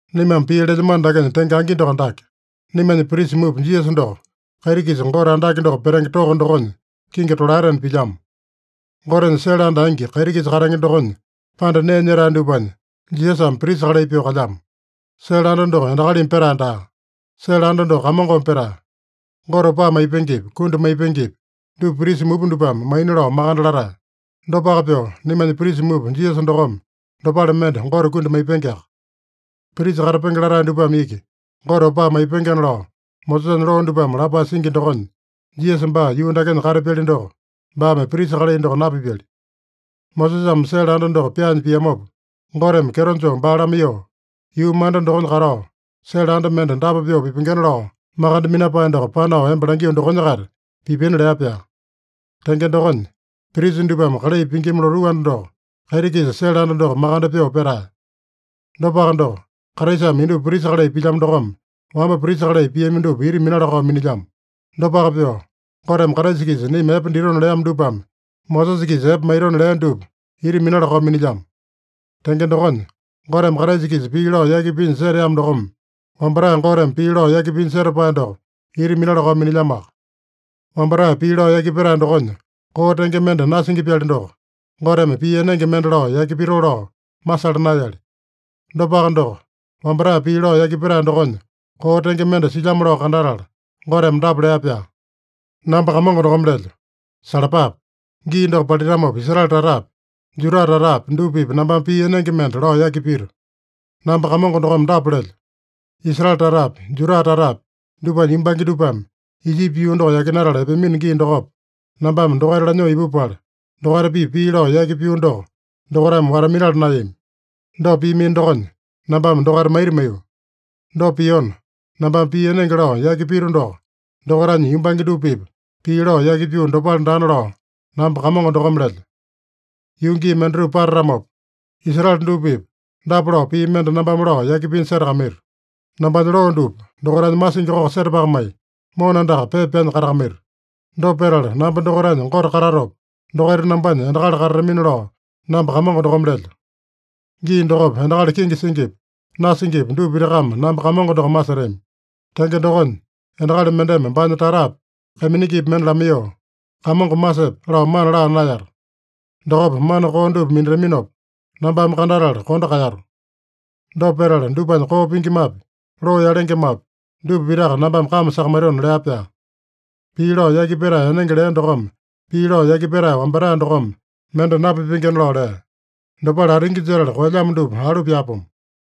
Naimame pii lelyamano dakenya tenge angi doko dake: Naimanya prisa mupa Jisasa doko, kaiti-kisa Gote andake doko petenge toko dokonya kingi tolaetena pilyamo. Gotenya sele anda angi, kaiti-kisa katenge dokonya panda nee nyetae dupanya Jisasame prisa kalai pyoo kalyamo. Sele anda doko endakalimi petae daa. Sele anda doko Kamongome petae. Gote opaa maipengepi, kundi maipengepi, dupa prisa mupa dupame maina lao makande latae. Dopaka pyoo, naimanya prisa mupa Jisasa dokome dopale mende Gote kundi maipengeaka. Prisa katapenge latae dupame iki Gote opaa maipengena lao Mosesanya loo dupame lapae singi dokonya, Jisasa baa yuu dakenya katapyali doko, baame prisa kalai doko napipyali. Mosesame sele anda doko pyaanya piamopa, Goteme kyeto joo baa lamaiyoo, “Yuu manda dokonya katao, sele anda mende dapa pyoo pipengena lao makande minapae doko panao emba langio dokonya-kaita pipina” lea-pyaa. Tenge dokonya, prisa dupame kalai pingima lotuu anda doko, kaiti-kisa sele anda doko makande pyoo petae. Dopaka doko, Kraisame indupa prisa kalai pilyamo dokome, wamba prisa kalai piami dupa ita minala-kao minilyamo. Dopaka pyoo, Goteme Kraisa-kisa naima epe ditona leamo dupame, Mosesa-kisa epe maitona lea dupa ita minala-kao minilyamo. Tenge dokonya, Goteme Kraisa-kisa pii lao yaki pinya seteamo dokome, wambatae Goteme pii lao yaki pinya setapae doko ita minala-kao minilyamoaka. Wambatae pii lao yaki petae dokonya koo tenge mende nasingi-pyali doko, Goteme pii enenge mende lao yaki pitoo lao masala naeyali. Dopaka doko, wambatae pii lao yaki petae dokonya koo tenge mende silyamo lao kandatala, Goteme dapa lea-pyaa: “Namba Kamongo dokome lelyo: Salapape! Gii doko palitamopa Israele tatapi, Juda tatapi dupa-pipa nambame pii enenge mende lao yaki pito. Namba Kamongo dokome dapa lelyo: Israele tatapi, Juda tatapi, dupanya yumbange dupame Ijipi yuu doko yakinatala epeamino gii dokopa, nambame dokaita lanyoo ipupala, dokaita-pipa pii lao yaki pio doko dokaitame wata-minala naeyami. Dopa piamino dokonya, nambame dokaita maita maiyo. Dopa piona, nambame pii enenge lao yaki pito doko, dokaitanya yumbange dupa-pipa pii lao yaki pio dopale daana lao namba Kamongo dokome lelyo. Yuu gii mendatupa patatamopa, Israele dupa-pipa dapa lao pii mende nambame lao yaki pinya setakamaito: Nambanya loo dupa dokaitanya masingi koko setapakamai, mona andaka pepa pyanya katakamaito. Dopa petala namba dokaitanya Gote katatopa, dokaita nambanya endakali katatamina lao namba Kamongo dokome lelyo. Gii dokopa endakali kenge singipi, nasingipi dupa pitakame namba Kamongo doko masetami. Tenge dokonya, endakali mendeme baanya tatapi, kaiminingipi mende lamaiyoo, ‘Kamongo masepe’ lao mana laa naeyata. Dokopa mana koo dupa minataminopa, nambame kandatala kondo kaeyato. Dopa petala dupanya koo pingimapi, loo yalengemapi, dupa pitaka nambame kame sakamaitona” lea-pyaa. Pii lao yaki petae enenge lea dokome pii lao yaki petae wambatae dokome mende napipengena lao lea. Dopale atingi jetala koelyamo dupa alu pyaapomo.